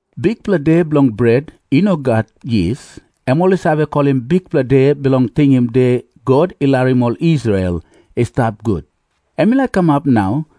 Bikpela De Bilong Bret I No Gat Yis, em ol i save kolim Bikpela De Bilong Tingim De God I Larim Ol Israel I Stap Gut, em i laik kamap nau.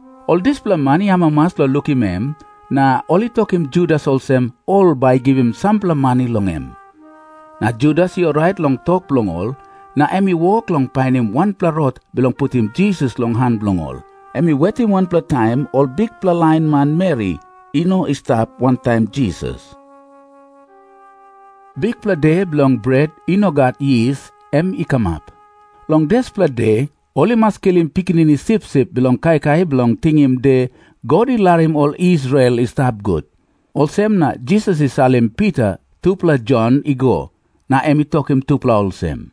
Ol dispela man i amamas long lukim em, na ol i tokim Judas olsem ol bai i givim sampela mani long em. Na Judas i orait long tok bilong ol, na em i wok long painim wanpela rot bilong putim Jisas long han bilong ol. Em i wetim wanpela taim ol bikpela lain manmeri i no i stap wantaim Jisas. Bikpela De Bilong Bret I No Gat Yis em i kamap. Long dispela de ol i mas kilim pikinini sipsip bilong kaikai bilong tingim De God I Larim Ol Israel I Stap Gut. Olsem na Jisas i salim Pita tupela Jon i go, na em i tokim tupela olsem,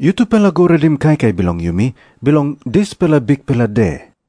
“Yutupela go redim kaikai bilong yumi bilong dispela bikpela de.”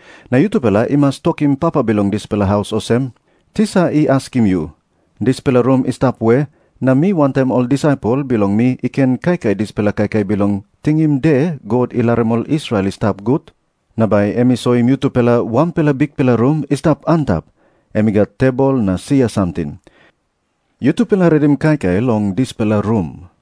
Na yutupela i mas tokim papa bilong dispela haus olsem, ‘Tisa i askim yu, “Dispela rum i stap we na mi wantaim ol disaipel bilong mi i ken kaikai dispela kaikai bilong tingim De God I Larim Ol Israel I Stap Gut?” ’ Na bai em i soim yutupela wanpela bikpela rum i stap antap, em i gat tebol na sia samting. Yutupela redim kaikai long dispela rum.”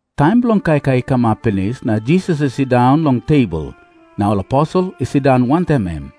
Taim bilong kaikai i kamap pinis, na Jisas i sindaun long tebol, na ol aposel i sindaun wantaim em.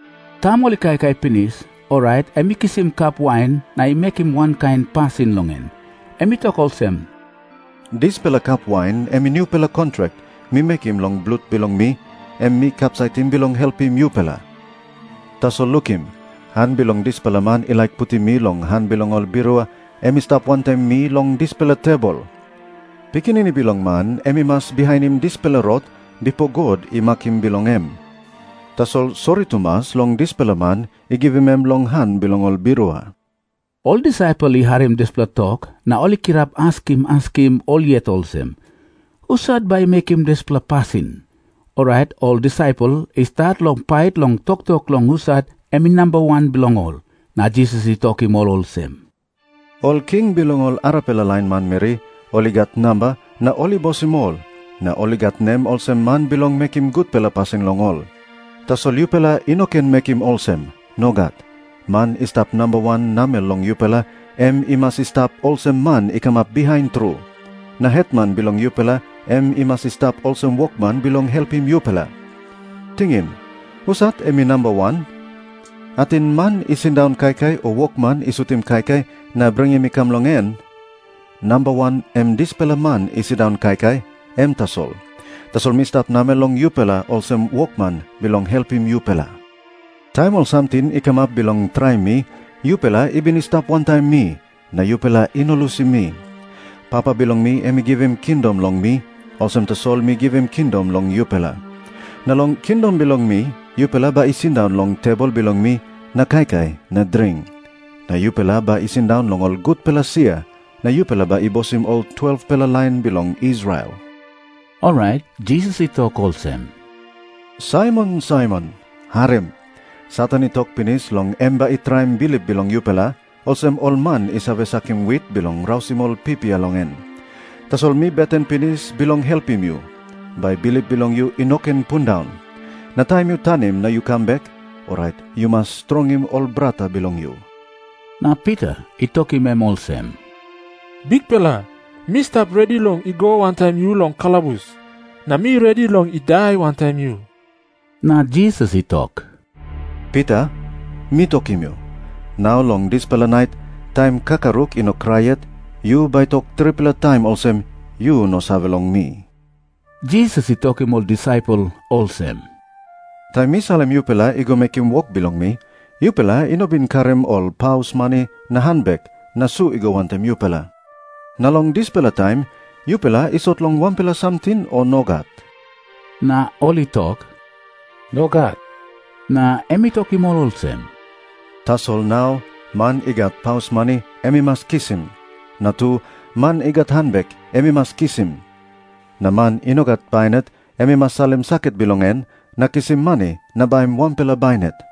Taim ol i kaikai pinis, orait em i kisim kap wain na i mekim wankain pasin long en. Em i tok olsem, “Dispela kap wain em i nupela kontrak mi mekim long blut bilong mi, em mi kapsaitim bilong helpim yupela. Tasol lukim, han bilong dispela man i laik putim mi long han bilong ol birua em i stap wantaim mi long dispela tebol. Pikinini Bilong Man em i mas bihainim dispela rot bipo God i makim bilong em. Tasol sori tumas long dispela man i givim em long han bilong ol birua.” Ol disaipel i harim dispela tok na ol i kirap askim askim ol yet olsem, “Husat bai i mekim dispela pasin?” Orait ol disaipel i stat long pait long toktok long husat em i namba wan bilong ol. Na Jisas i tokim ol olsem, “Ol king bilong ol arapela lain manmeri ol i gat namba na ol i bosim ol, na ol i gat nem olsem man bilong mekim gutpela pasin long ol. Tasol yupela i no ken mekim olsem. Nogat. Man i stap namba wan namel long yupela, em i mas i stap olsem man i kamap bihain tru. Na hetman bilong yupela em i mas i stap olsem wokman bilong helpim yupela. Tingim. Husat em i namba wan? Ating man i sindaun kaikai o wokman i sutim kaikai na bringim i kam long en? Namba wan em dispela man i sindaun kaikai, em tasol. Tasol mi stap namel long yupela olsem wokman bilong helpim yupela. “Taim ol samting i kamap bilong traim mi, yupela i bin i stap wantaim mi, na yupela i no lusim mi. Papa bilong mi em i givim kingdom long mi, olsem tasol mi givim kingdom long yupela. Na long kingdom bilong mi yupela bai i sindaun long tebol bilong mi na kaikai na dring. Na yupela bai i sindaun long ol gutpela sia na yupela bai i bosim ol 12-pela lain bilong Israel.” Orait Jisas i tok olsem, “Saimon, Saimon, harim. Satan i tok pinis long em bai i traim bilip bilong yupela, olsem ol man i save sakim wit bilong rausim ol pipia long en. Tasol mi beten pinis bilong helpim yu, bai bilip bilong yu i no ken pundaun. Na taim yu tanim na yu kam bek, orait yu mas strongim ol brata bilong yu.” Na Pita i tokim em olsem, “Bikpela, mi stap redi long i go wantaim yu long kalabus. Na mi redi long i dai wantaim yu.” Na Jisas i tok, “Pita, mi tokim yu, nau long dispela nait, taim kakaruk i no krai yet, yu bai tok tripela taim olsem yu no save long mi.” Jisas i tokim ol disaipel olsem, “Taim mi salim yupela i go mekim wok bilong mi, yupela i no bin karim ol paus mani na hanbek na su i go wantaim yupela. Na long dispela taim yupela i sot long wanpela samting, o nogat?” Na ol i tok, “Nogat.” Na em i tokim ol olsem, “Tasol nau man i gat paus mani, em i mas kisim. Na tu, man i gat hanbek em i mas kisim. Na man i no gat bainat, em i mas salim saket bilong en na kisim mani na baim wanpela bainat.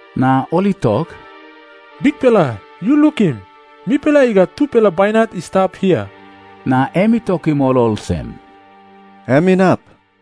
Na ol i tok, “Bikpela, yu lukim. Mipela i gat tupela bainat i stap hia.” Na em i tokim ol olsem, “Em inap.”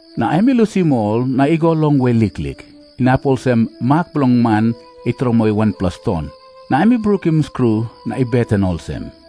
Na em i lusim ol na i go longwe liklik, inap olsem mak bilong man i tromoi wanpela ston. Na em i brukim skru na i beten olsem,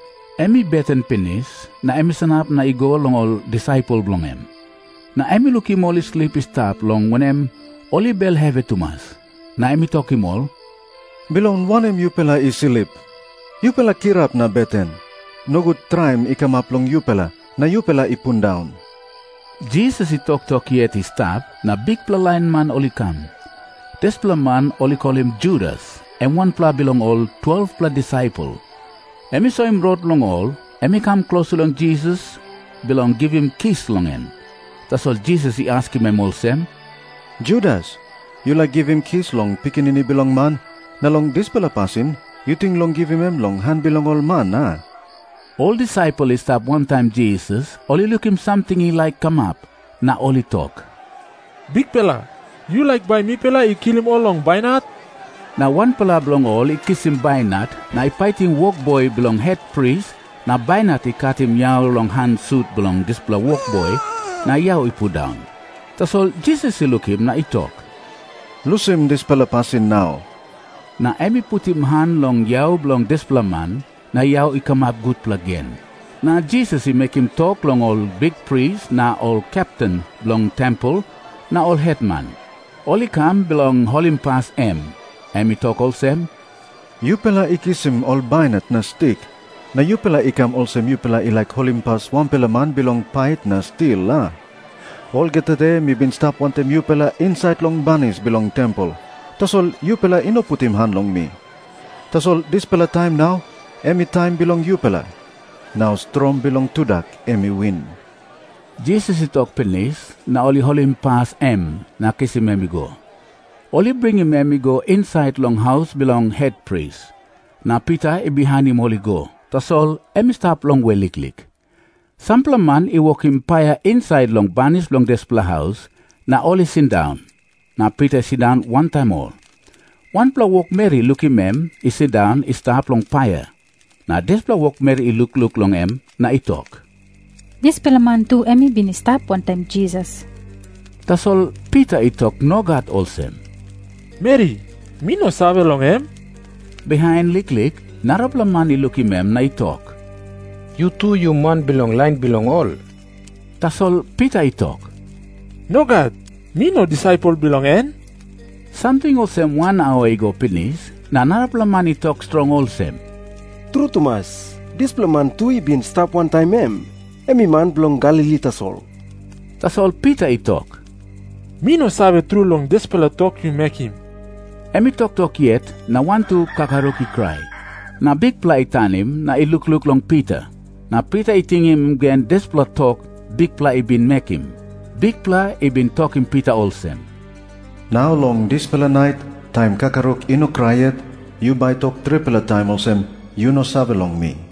Em i beten pinis na em i sanap na i go long ol disaipel bilong en. Na em i lukim ol i slip i stap, long wanem, ol i bel hevi tumas. Na em i tokim ol, “Bilong wanem yupela i slip? Yupela kirap na beten. Nogut traim i kamap long yupela, na yupela i pundaun.” Jisas i toktok yet i stap, na bikpela lain man ol i kam. Dispela man ol i kolim Judas, em wanpela bilong ol 12-pela disaipel, em i soim rot long ol. Em i kam klostu long Jisas bilong givim kis long em. Tasol Jisas i askim em olsem, “Judas, yu laik givim kis long Pikinini Bilong Man na long dispela pasin yu ting long givim em long han bilong ol man, a?” Ol disaipel i stap wantaim Jisas ol i lukim samting i laik kamap, na ol i tok, “Bikpela, yu laik bai mipela i kilim ol long bainat?” Na wanpela bilong ol i kisim bainat na i paitim wokboi bilong hetpris, na bainat i katim yau long han sut bilong dispela wokboi na yau i pundaun. Tasol Jisas i lukim na i tok, “Lusim dispela pasin nau.” Na em i putim han long yau bilong dispela man, na yau i kamap gutpela gen. Na Jisas i mekim tok long ol bikpris na ol kepten bilong tempel na ol hetman, ol i kam bilong holimpas em. Em i tok olsem, “Yupela i kisim ol bainat na stik, na yupela i kam olsem yupela i laik holimpas wanpela man bilong pait na stil, a? Olgeta de mi bin stap wantaim yupela insait long banis bilong tempel, tasol yupela i no putim han long mi. Tasol dispela taim nau em i taim bilong yupela. Nau strong bilong tudak em i win.” Jisas i tok pinis, na ol i holimpas em na kisim em i go. Ol i bringim em i go insait long haus bilong hetpris. Na Pita i bihainim ol i go, tasol em i stap longwe liklik. Sampela man i wokim paia insait long banis bilong dispela haus, na ol i sindaun. Na Pita i sindaun wantaim ol. Wanpela wokmeri i lukim em i sindaun i stap long paia. Na dispela wokmeri i lukluk long em na i tok, “Dispela man tu em i bin i stap wantaim Jisas.” Tasol Pita i tok nogat olsem, “Meri, mi no save long em.” Bihain liklik narapela man i lukim em na i tok, “Yu tu yu man bilong lain bilong ol.” Tasol Pita i tok, “Nogat. Mi no disaipel bilong en.” Samting olsem wan aua i go pinis, na narapela man i tok strong olsem, “Tru tumas, dispela man tu i bin i stap wantaim em. Em i man bilong Galili tasol.” Tasol Pita i tok, “Mi no save tru long dispela tok yu mekim.” Em i toktok yet, na wantu kakaruk i krai. Na Bikpela i tanim na i lukluk long Pita. Na Pita i tingim gen dispela tok Bikpela i bin mekim. Bikpela i bin tokim Pita olsem, “Nau long dispela nait, taim kakaruk i no krai yet, yu bai tok tripela taim olsem yu no save long mi.”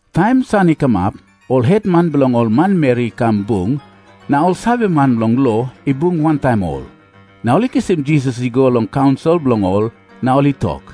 Taim san i kamap, ol hetman bilong ol manmeri i kam bung, na ol saveman bilong lo i bung wantaim ol. Na ol i kisim Jisas i kam long bung bilong ol, na ol i tok,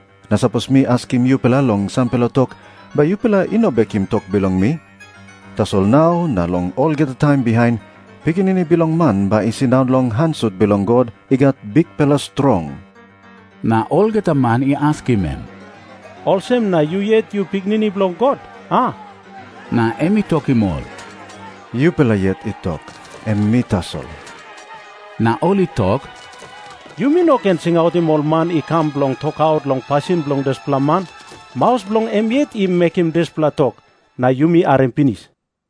Na sapos mi askim yupela long sampela tok, bai yupela i no bekim tok bilong mi. Tasol nau na long olgeta taim bihain Pikinini Bilong Man bai i sindaun long han sut bilong God i gat bikpela strong.” Na olgeta man i askim em, “Olsem na yu yet yu Pikinini Bilong God, a?” Na em i tokim ol, “Yupela yet i tok. Em mi tasol.” Na ol i tok, “Yumi no ken singautim ol man i kam bilong tokaut long pasin bilong dispela man. Maus bilong em yet i mekim dispela tok, na yumi harim pinis.”